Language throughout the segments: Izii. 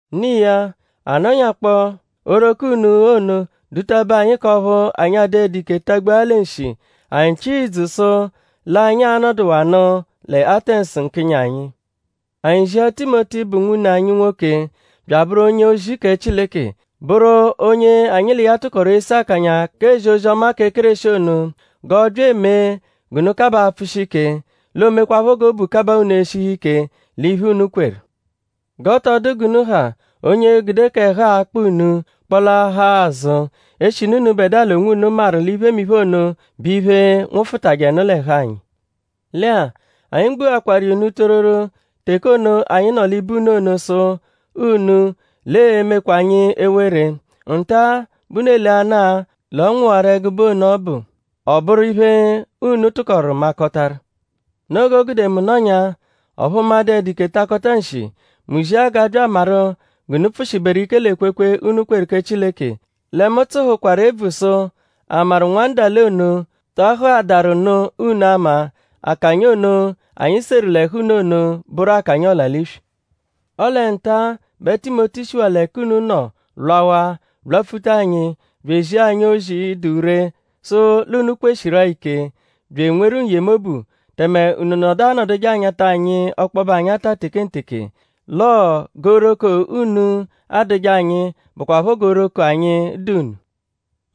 No iya; a nọnyakpoo; oghoroko unu ono dụta-be anyi; k'ọphu anyi adụedu ike tagbua ya lẹ nshi; anyi chịa ìdzù sụ l'anyi a-nọduwanu lẹ Atẹnsu nkịnyi anyi. Anyi zia Timoti, bụ nwune anyi nwoke; bya abụru onye-ozi kẹ Chileke; bụru onye anyi l'iya tụkoru ese akanya k'ezi ozi-ọma kẹ Kéreshi ono; g'ọ bya emee g'unu kabaa apfụshi ike; l'o mekwaphọ g'obu kabaa unu eshihu ike l'iphe, unu kweru. G'ọ tọ dụ g'unu ha onye e-gude k'ẹhu-a, aakpa unu-a kpọlaahaa azụ; eshinu unubẹdua l'onwunu maru l'iphemiphe ono bụ iphe, nwụfutajenu l'ẹhu anyi. Lẹ-a; anyi gbuakwaru iya unu tororo; teke ono, anyi nọ l'ibe unu ono sụ unu l'ee-mekwa anyi ewere. Nta-a bẹ unu eleanaa l'ọ nwụwaru ẹgube ono ọbu; ọ bụru iphe, unu tụkoru makọtaru. Noo g'o gude mu nọnyaa; ọphu mu adụedu ike takọta nshi; mu zia g'a bya amaru g'unu pfụ-shiberu ike l'ekwekwe, unu kweru kẹ Chileke. Lẹ mu tsụhukwaru ebvu sụ?a maru nwandale ono ta ahụadaaru nụ unu ama; akanya ono, anyi seru l'ẹhu unu ono bụru akanya ọla-l'iswi. Ọle nta-a bẹ Timoti shiwaa l'ẹka unu nọ lwawaa lwapfuta anyi bya ezia anyi ozi, dụ ree sụ l'unu kweshiru-a ike; bya enweru n-yemobu; tẹme unu nọdu anọduje anyata anyi ọkpobe anyata tekenteke. L'ọo g'oghoroko unu adụje anyi bụkwapho g'oghoroko anyi dụ unu.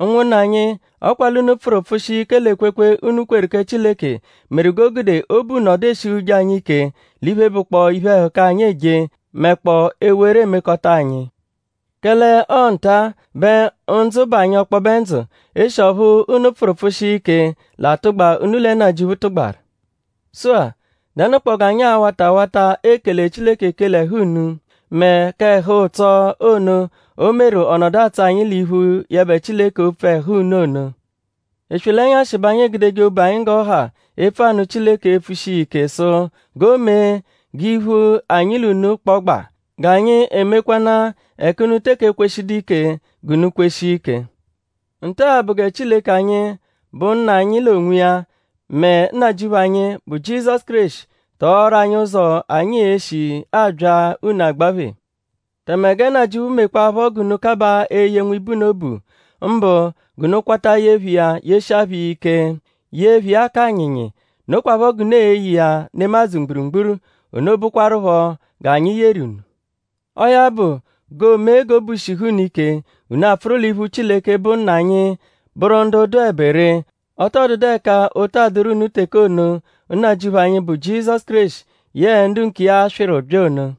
Ụnwunna anyi; ọ kwa l'unu pfụru pfụshia ike l'ekwekwe, unu kweru kẹ Chileke meru g'o gude obu nọdu eshihuje anyi ike l'iphe, bụkpoo iphe-ẹhuka, anyi eje; mẹkpoo ewere, eemekọta anyi. Kẹle ọo nta-a bẹ ndzụ bụ anyi ọkpobe ndzụ; eshi ọphu unu pfụru pfụshia ike l'atụgba, unu lẹ Nnajịuphu tụgbaru. Sụ-a;?dẹnukpoo g'anyi a-wata awata ekele Chileke ekele ẹhu unu; mẹ k'ẹhu-ụtso ono, o meru ọ nọdu atsọ anyi l'iphu yẹbe Chileke opfu ẹhu unu ono? Eswe l'ẹnyashi bẹ anyi egudeje obu anyi g'ọ ha epfu anụ Chileke epfushi iya ike sụ g'o mee g'iphu anyi l'unu kpọgba; g'anyi e-mekwanaa; ẹka unu teke ekweshidu ike g'unu kweshia ike. Nta-a bụ gẹ Chileke anyi, bụ Nna anyi l'onwiya; mẹ Nnajịuphu anyi, bụ Jizọsu Kéreshi tọoru anyi ụzo, anyi e-shi abya unu agbaphe. Tẹme gẹ Nnajịuphu mekwaaphọ g'unu kabaa eye nwibe unu obu; mbụ g'unu kwata ye phẹ iya yeshia phẹ iya ike; ye phẹ iya k'anyịnyi. Nokwaphọ g'unu e-ye iya nemadzụ mgburugburu. Ono bụkwarupho g'anyi yeru unu. Ọo ya bụ; g'oo-mee g'obu shihu unu ike; unu a-pfụru l'iphu Chileke, bụ Nna anyi bụru ndu dụebe ree. Ọ tọ dụdu ẹka ụta adụru unu teke ono, Nnajịuphu anyi, bụ Jizọsu Kéreshi yẹe ndu nkiya a-swịru bya ono.